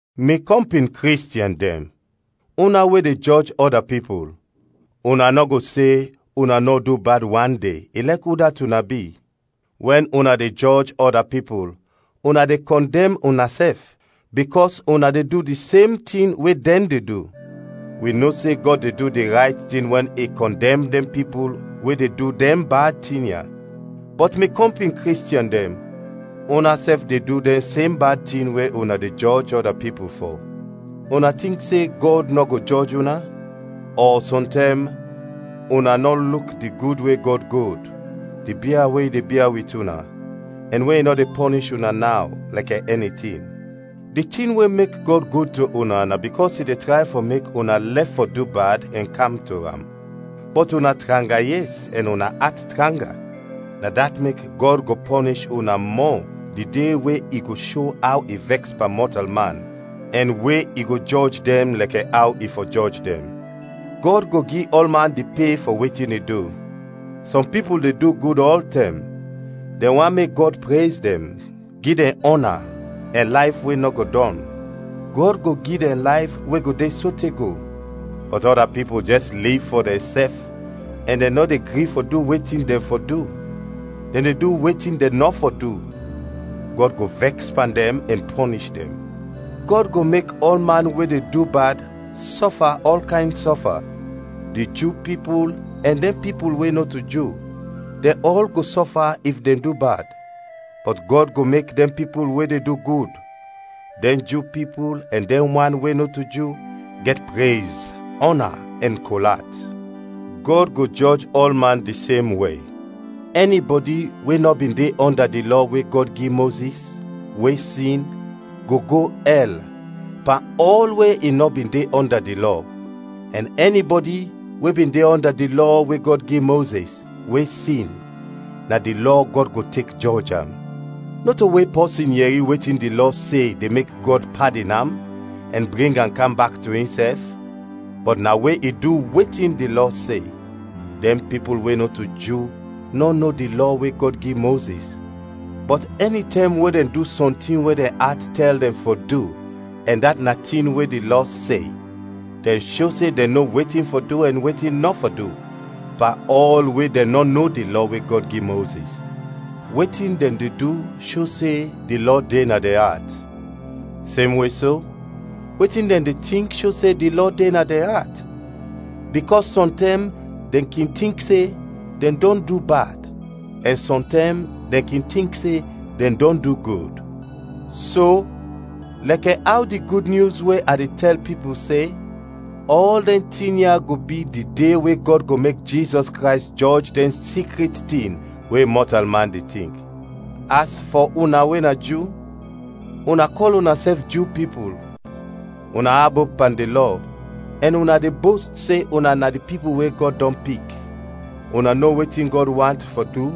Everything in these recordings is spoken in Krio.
Mi kɔmpin Kristiɛn dɛn, una we de jɔj ɔda pipul, una nɔ go se una nɔ du bad wan de, ilɛk udat una bi. Wɛn una de jɔj ɔda pipul, una de kɔndɛm unasɛf, bikɔs una de du di sem tin we dɛn de du. Wi no se Gɔd de du di rayt tin wɛn i kɔndɛm dɛn pipul we de du dɛn bad tin ya. Bɔt mi kɔmpin Kristiɛn dɛn, unasɛf de du dɛn sem bad tin we una de jɔj ɔda pipul fɔ. Una tink se Gɔd nɔ go jɔj una? Ɔ sɔntɛm una nɔ luk di gud we Gɔd gud, di bia we i de bia wit una, ɛn we i nɔ de pɔnish una naw, lɛkɛ ɛni tin. Di tin we mek Gɔd gud to una na bikɔs i de tray fɔ mek una lɛf fɔ du bad ɛn kam to am. Bɔt una tranga yes ɛn una at tranga, na dat mek Gɔd go pɔnish una mɔ di de we i go sho aw i vɛks pan mɔtalman ɛn we i go jɔj dɛn lɛkɛ aw i fɔ jɔj dɛn. Gɔd go gi ɔlman di pe fɔ wetin i du. Sɔm pipul de du gud ɔltɛm, dɛn want mek Gɔd prez dɛn, gi dɛn ɔna, ɛn layf we nɔ go dɔn. Gɔd go gi dɛn layf we go de sote go. Bɔt ɔda pipul jɛs liv fɔ dɛnsɛf ɛn dɛn nɔ de gri fɔ du wetin dɛn fɔ du, dɛn de du wetin dɛn nɔ fɔ du; Gɔd go vɛks pan dɛn ɛn pɔnish dɛn. Gɔd go mek ɔlman we de du bad, sɔfa ɔl kayn sɔfa, di Ju pipul ɛn dɛn pipul we nɔto Ju, dɛn ɔl go sɔfa if dɛn du bad. Bɔt Gɔd go mek dɛn pipul we de du gud, dɛn Ju pipul ɛn dɛn wan we nɔto Ju, gɛt prez, ɔna, ɛn kol at. Gɔd go jɔj ɔlman di sem we. Ɛnibɔdi we nɔ bin de ɔnda di Lɔ we Gɔd gi Mozis, we sin, go go ɛl, pan ɔl we i nɔ bin de ɔnda di Lɔ; ɛn ɛnibɔdi we bin de ɔnda di Lɔ we Gɔd gi Mozis, we sin, na di Lɔ Gɔd go tek jɔj am. Nɔto we pɔsin yɛri wetin di Lɔ se de mek Gɔd padin am ɛn bring am kam bak to insɛf, bɔt na we i du wetin di Lɔ se. Dɛn pipul we nɔto Ju nɔ no di Lɔ we Gɔd gi Mozis, bɔt ɛnitɛm we dɛn du sɔntin we dɛn at tɛl dɛn fɔ du ɛn dat na tin we di Lɔ se, dɛn sho se dɛn no wetin fɔ du ɛn wetin nɔ fɔ du, pan ɔl we dɛn nɔ no di Lɔ we Gɔd gi Mozis. Wetin dɛn de du sho se di Lɔ de na dɛn at. Semwe so, wetin dɛn de tink sho se di Lɔ de na dɛn at, bikɔs sɔntɛm dɛn kin tink se, dɛn dɔn du bad, ɛn sɔntɛm dɛn kin tink se, dɛn dɔn du gud. So, lɛkɛ aw di Gud Nyus we a de tɛl pipul se, ɔl dɛn tin ya go bi di De we Gɔd go mek Jizɔs Krays jɔj dɛn sikrit tin we mɔtalman de tink. As fɔ una we na Ju: una kɔl unasɛf Ju pipul; una abop pan di Lɔ, ɛn una de bost se una na di pipul we Gɔd dɔn pik. Una no wetin Gɔd want fɔ du,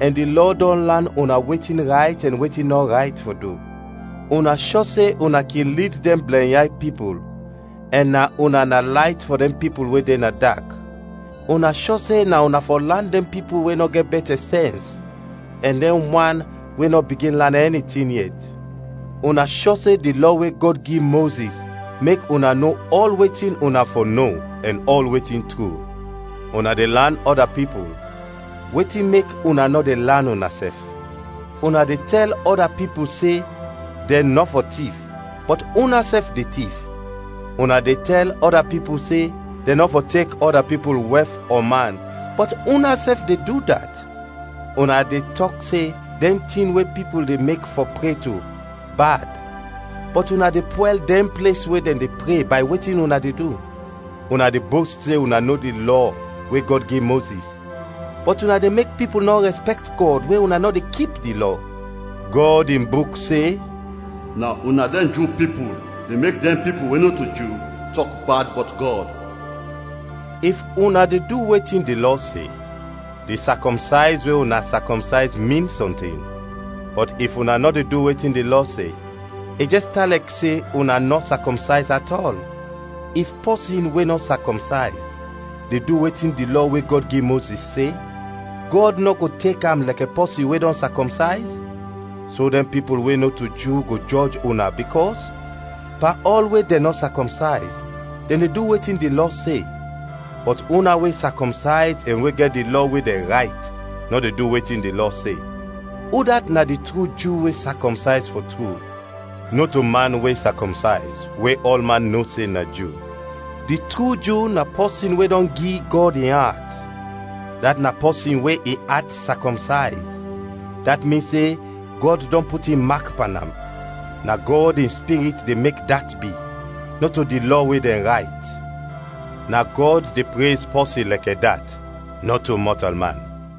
ɛn di Lɔ dɔn lan una wetin rayt ɛn wetin nɔ rayt fɔ du; una shɔ se una kin lid dɛn blɛnyay pipul, ɛn na una na layt fɔ dɛn pipul we de na dak, una shɔ se na una fɔ lan dɛn pipul we nɔ gɛt bɛtɛ sɛns ɛn dɛn wan we nɔ bigin lan ɛni tin yet. Una shɔ se di Lɔ we Gɔd gi Mozis mek una no ɔl wetin una fɔ no ɛn ɔl wetin tru. Una de lan ɔda pipul, wetin mek una nɔ de lan unasɛf? Una de tɛl ɔda pipul se, dɛn nɔ fɔ tif, bɔt unasɛf de tif. Una de tɛl ɔda pipul se, dɛn nɔ fɔ tek ɔda pipul wɛf ɔ man, bɔt unasɛf de du dat. Una de tɔk se dɛn tin we pipul de mek fɔ pre to, bad, bɔt una de pwɛl dɛn ples we dɛn de pre bay wetin una de du. Una de bost se una no di Lɔ we Gɔd gi Mozis, bɔt una de mek pipul nɔ rɛspɛkt Gɔd we una nɔ de kip di Lɔ. Gɔd in Buk se, “Na una dɛn Ju pipul de mek dɛn pipul we nɔto Ju tɔk bad bɔt Gɔd.” If una de du wetin di Lɔ se, di sakɔmsayz we una sakɔmsayz min sɔntin; bɔt if una nɔ de du wetin di Lɔ se, i jɛs tan lɛkɛ se una nɔ sakɔmsayz atɔl. If pɔsin we nɔ sakɔmsayz, de du wetin di Lɔ we Gɔd gi Mozis se, Gɔd nɔ go tek am lɛkɛ pɔsin we dɔn sakɔmsayz? So dɛn pipul we nɔto Ju go jɔj una bikɔs, pan ɔl we dɛn nɔ sakɔmsayz, dɛn de du wetin di Lɔ se, bɔt una we sakɔmsayz ɛn we gɛt di Lɔ we dɛn rayt, nɔ de du wetin di Lɔ se. Udat na di tru Ju we sakɔmsayz fɔ tru? Nɔto man we sakɔmsayz, we ɔlman no se na Ju. Di tru Ju na pɔsin we dɔn gi Gɔd in at, dat na pɔsin we in at sakɔmsayz, dat min se Gɔd dɔn put in mak pan am. Na Gɔd in Spirit de mek dat bi, nɔto di Lɔ we dɛn rayt. Na Gɔd de prez pɔsin lɛkɛ dat, nɔto mɔtalman.